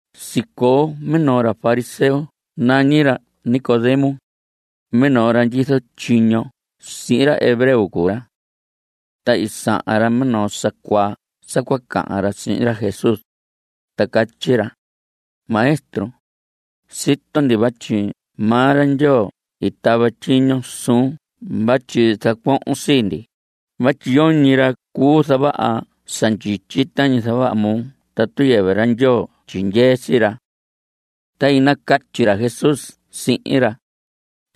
Sicoo minoo ra fariseo nañi ra Nicodemo. Minoo ra ndyizo tyiño sihin ra hebreo cuu ra. Ta i sahan ra minoo sa cuaa sa cua cahan ra sihin ra Jesús, ta catyi ra: Maestro, sito ndi vatyi maa ra Ndyoo i tava tyiño suun vatyi zacuohon sii ndi vatyi yoñi ra cuu zavaha sa ndyityi tañi zavaha moo tatu yɨvɨ ra Ndyoo tyindyee sii ra. Ta i nacatyi ra Jesús sihin ra: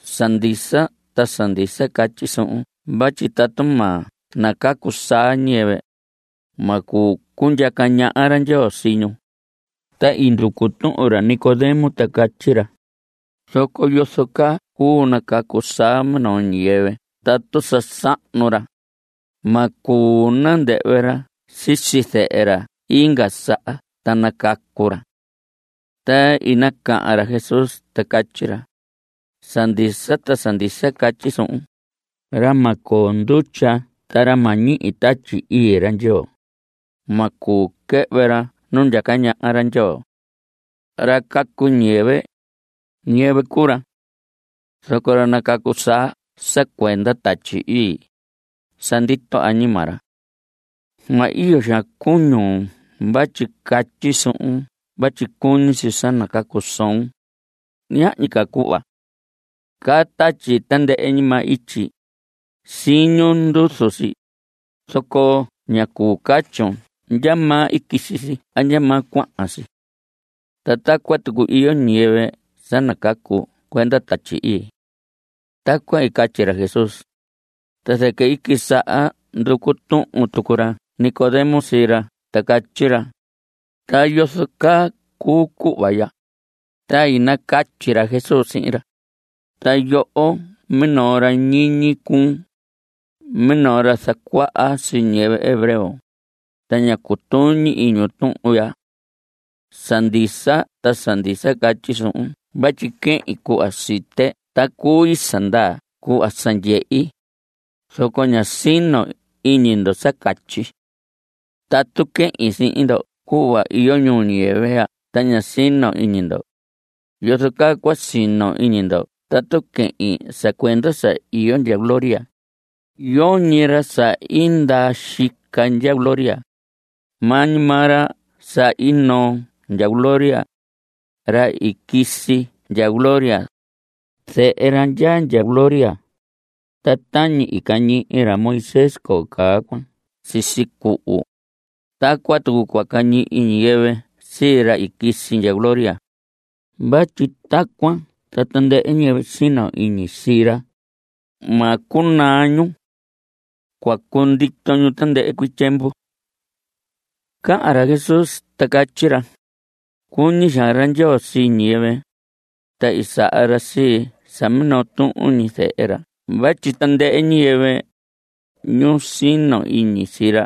Sa ndisa ta sa ndisa catyi suhun vatyi tatu ma nacacu saa ñiyɨvɨ, ma cuu cundyaca ñaha ra Ndyoo sii ñu. Ta i nducu tuhun ra Nicodemo ta catyi ra: ¿Zoco yozo caa cuu nacacu saa minoo ñiyɨvɨ tatu sa sahnu ra? Ma cuu nandɨhvɨ ra sisi zɨhɨ ra inga saha ta nacacu ra. Ta i nacahan ra Jesús ta catyi ra: Sa ndisa ta sa ndisa catyi suhun, ra ma coo ndutya ta ra ma ñihi Tatyi Ii ra Ndyoo, ma cuu quɨhvɨ ra nu ndyaca ñaha ra Ndyoo. Ra cacu ñiyɨvɨ, ñiyɨvɨ cuu ra. Zoco ra nacacu saa sa cuenda Tatyi Ii, sa ndito añima ra. Ma iyo xaan cuñun vatyi catyi suhun vatyi cuñi si sa nacacu soon. Ñahñi ca cuhva. Caá tatyi tandɨhɨ ñi maa ityi. Siñun nduzu si, zoco ña cuu catyun ndyamaa i quisi si a ndyamaa cuahan si. Ta tacuan tucu iyo ñiyɨvɨ sa nacacu cuenda Tatyi Ii. Tacuan i catyi ra Jesús, ta zɨquɨ i quisaha nducu tuhun tucu ra Nicodemo sii ra ta catyi ra: ¿Ta yozo caa cuu cuhva ya? Ta i nacatyi ra Jesús sihin ra: Ta yoho minoo ra ñiñi cuun, minoo ra zacuaha sii ñiyɨvɨ hebreo, ta ña cutuñi iñun tuhun ya. Sa ndisa ta sa ndisa catyi suhun vatyi quehin cuhva site ta cui sa ndaa cuhva sa ndyehi, zoco ña sino iñi ndo sa catyi. Tatu quehin sihin ndo cuhva iyo ñuu ñiyɨvɨ ya ta ña sino iñi ndo, ¿yozo caa cua sino iñi ndo tatu quehin sa cuenda sa iyo ndya gloria? Yoñi ra sa i ndaa xica ndya gloria, maa ñi maa ra sa i noo ndya gloria, ra i quisi ndya gloria, zehe ra ndyaa ndya gloria. Ta tañi i cañihi ra Moisés coo caa cuan sisi cuhu, tacuan tucu cua cañihi ñiyɨvɨ sii ra i quisi ndya gloria. Vatyi tacuan ta tandɨhɨ ñiyɨvɨ sino iñi sii ra, ma cunaa ñu. Cua cundito ñu tandɨhɨ cuii tyiemvu. (Cahan ca ra Jesús, ta catyi ra:) Cuñi xaan ra Ndyoo sii ñiyɨvɨ, ta i saha ra sii sa minoo tuhun ñi zehe ra vatyi tandɨhɨ ñiyɨvɨ, ñu sino iñi sii ra,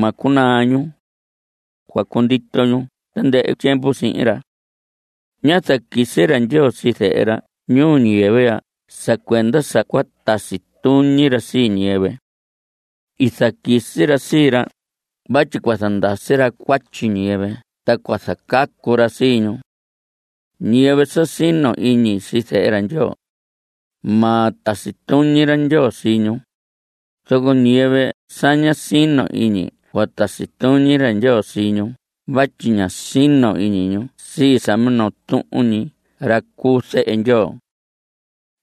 ma cunaa ñu. Cua cundito ñu tandɨhɨ tyiemvu sihin ra. Ñá zaquisi ra Ndyoo sii zehe ra ñuu ñiyɨvɨ ya sa cuenda sa cua tasi tuñi ra sii ñiyɨvɨ. I zaquisi ra sii ra vatyi cua zandasi ra cuatyi ñiyɨvɨ ta cua zacacu ra sii ñu. Ñiyɨvɨ sa sino iñi sii zehe ra Ndyoo, ma tasi tuñi ra Ndyoo sii ñu, zoco ñiyɨvɨ sa ña sino iñi cua tasi tuñi ra Ndyoo sii ñu vatyi ña sino iñi ñu sii sa minoo tuhun ñi ra cu zehe Ndyoo.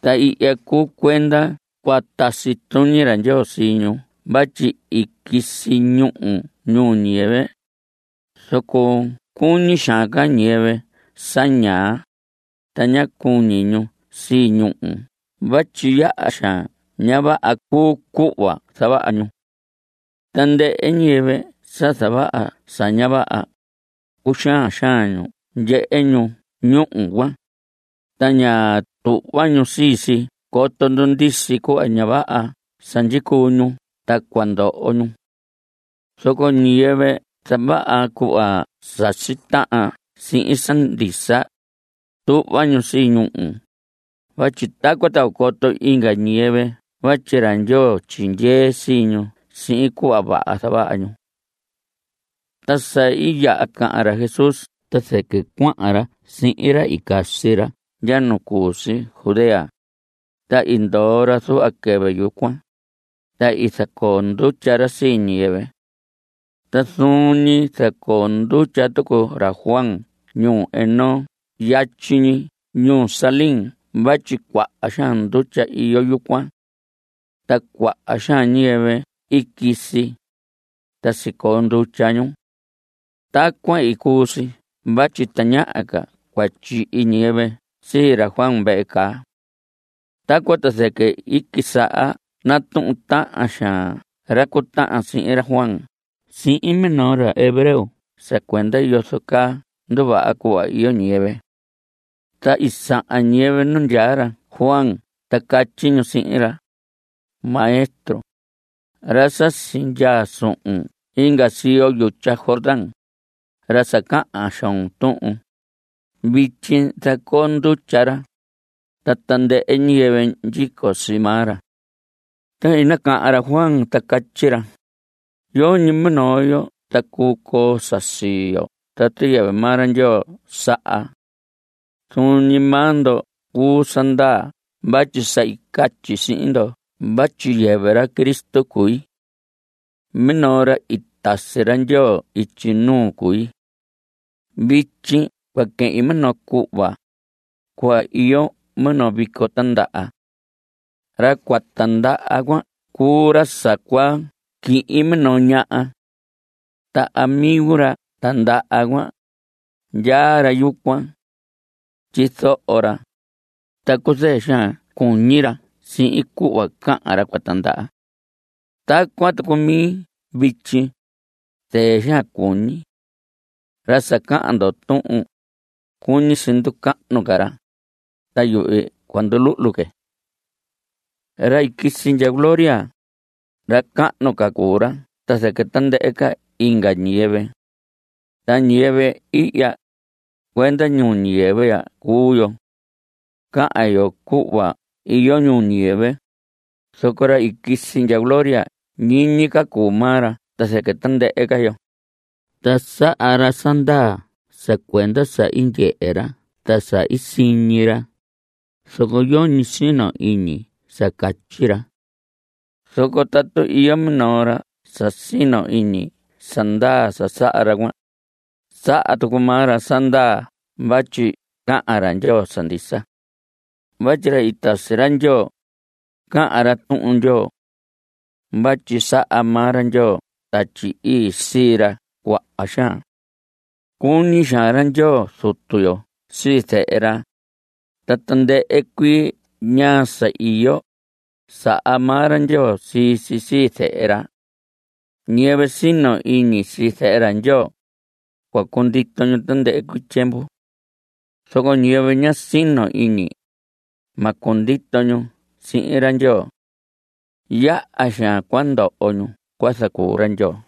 Ta ihya cuu cuenda cua tasi tuñi ra Ndyoo sii ñu vatyi i quisi ñúhu ñuu ñiyɨvɨ, zoco cuñi xaan ca ñiyɨvɨ sa ñaa, ta ña cuñi ñu sii ñúhu vatyi yaha xaan ña vaha cuu cuhva zavaha ñu. Tandɨhɨ ñiyɨvɨ sa zavaha sa ña vaha, cuxaan xaan ñu ndyehe ñu ñúhu cuan, ta ña tuhva ñu sii si coto ndundisi cuhva ña vaha sa ndyicuu ñu ta cua ndoho ñu. Zoco ñiyɨvɨ zavaha cuhva sasi tahan sihin sa ndisa, tuhva ñu sii ñúhu, vatyi tacuan ta cua coto inga ñiyɨvɨ vatyi ra Ndyoo tyindyee sii ñu sihin cuhva vaha zavaha ñu. Ta sa i yaha cahan ra Jesús ta zɨquɨ cuahan ra sihin ra i casi ra ndya nu cu si Judea, ta i ndoo ra zuhva quɨvɨ yucuan, ta i zacoo ndutya ra sii ñiyɨvɨ. Ta zuun ñi zacoo ndutya tucu ra Juan ñuu Enón yatyi ñi ñuu Salim vatyi cuaha xaan ndutya iyo yucuan. Ta cuaha xaan ñiyɨvɨ i quisi, ta sicoo ndutya ñu. Tacuan i cuu si vatyi tañaha ca cua tyihi ñiyɨvɨ sii ra Juan vehe caa. Tacuan ta zɨquɨ i quisaha natuhun tahan xaan ra cu tahan sihin ra Juan sihin minoo ra hebreo sa cuenda yozo caa nduvaha cuhva iyo ñiyɨvɨ. Ta i sahan ñiyɨvɨ nu ndyaa ra Juan ta catyi ñu sihin ra: Maestro, ra sa sindyaa suhun inga siyo yutya Jordán, ra sa cahan xoon tuhun, vityi zacoo ndutya ra, ta tandɨhɨ ñiyɨvɨ ndyico sii maa ra. Ta i nacahan ra Juan ta catyi ra: Yoñi minoo yo ta cuu coo sa sii yo tatu yɨvɨ maa ra Ndyoo saha. Zuun ñi maa ndo cuu sa ndaa vatyi sa i catyi sihin ndo vatyi yɨvɨ ra Cristo cui. Minoo ra i tasi ra Ndyoo ityi nuu cui. Vityi cua quehin minoo cuhva, cuhva iyo minoo vico tindaha. Ra cua tindaha cuan cuu ra sa cua quihin minoo ñaha. Ta amigo ra tindaha cuan, ndyaa ra yucuan. Tyizoho ra, ta cuzɨɨ xaan cuñi ra sihin cuhva cahan ra cua tindaha. Tacuan tucu mi vityi. Zɨɨ xaan cuñi. Ra sa cahan ndo tuhun, cuñi si nducahnu ca ra, ta yuhvi cua nduluhlu que. Ra i quisi ndya gloria, ra cahnu ca cuu ra ta zɨquɨ tandɨhɨ inga ñiyɨvɨ. Ta ñiyɨvɨ ihya, cuenda ñuu ñiyɨvɨ ya cuu yo. Cahan yo cuhva iyo ñuu ñiyɨvɨ. Zoco ra i quisi ndya gloria ñiñi ca cuu maa ra ta zɨquɨ tandɨhɨ ca yo. Ta saha ra sa ndaa sa cuenda sa i ndyehe ra ta sa i siñi ra, zoco yoñi sino iñi sa catyi ra. Zoco tatu iyo minoo ra sa sino iñi sa ndaa sa saha ra cuan, saha tucu maa ra sa ndaa vatyi cahan ra Ndyoo sa ndisa. Vatyi ra i tasi ra Ndyoo, cahan ra Tuhun Ndyoo. Vatyi saha maa ra Ndyoo Tatyi Ii sii ra cuaha xaan. Cuñi xaan ra Ndyoo Zutu yo sii Zehe ra, ta tandɨhɨ cuii ñaa sa iyo, saha maa ra Ndyoo sii si sii Zehe ra. Ñiyɨvɨ sino iñi sii Zehe ra Ndyoo, cua cundito ñu tandɨhɨ cuii tyiemvu. Zoco ñiyɨvɨ ña sino iñi, ma cundito ñu sihin ra Ndyoo. Yaha xaan cua ndoho ñu cua zacuu ra Ndyoo.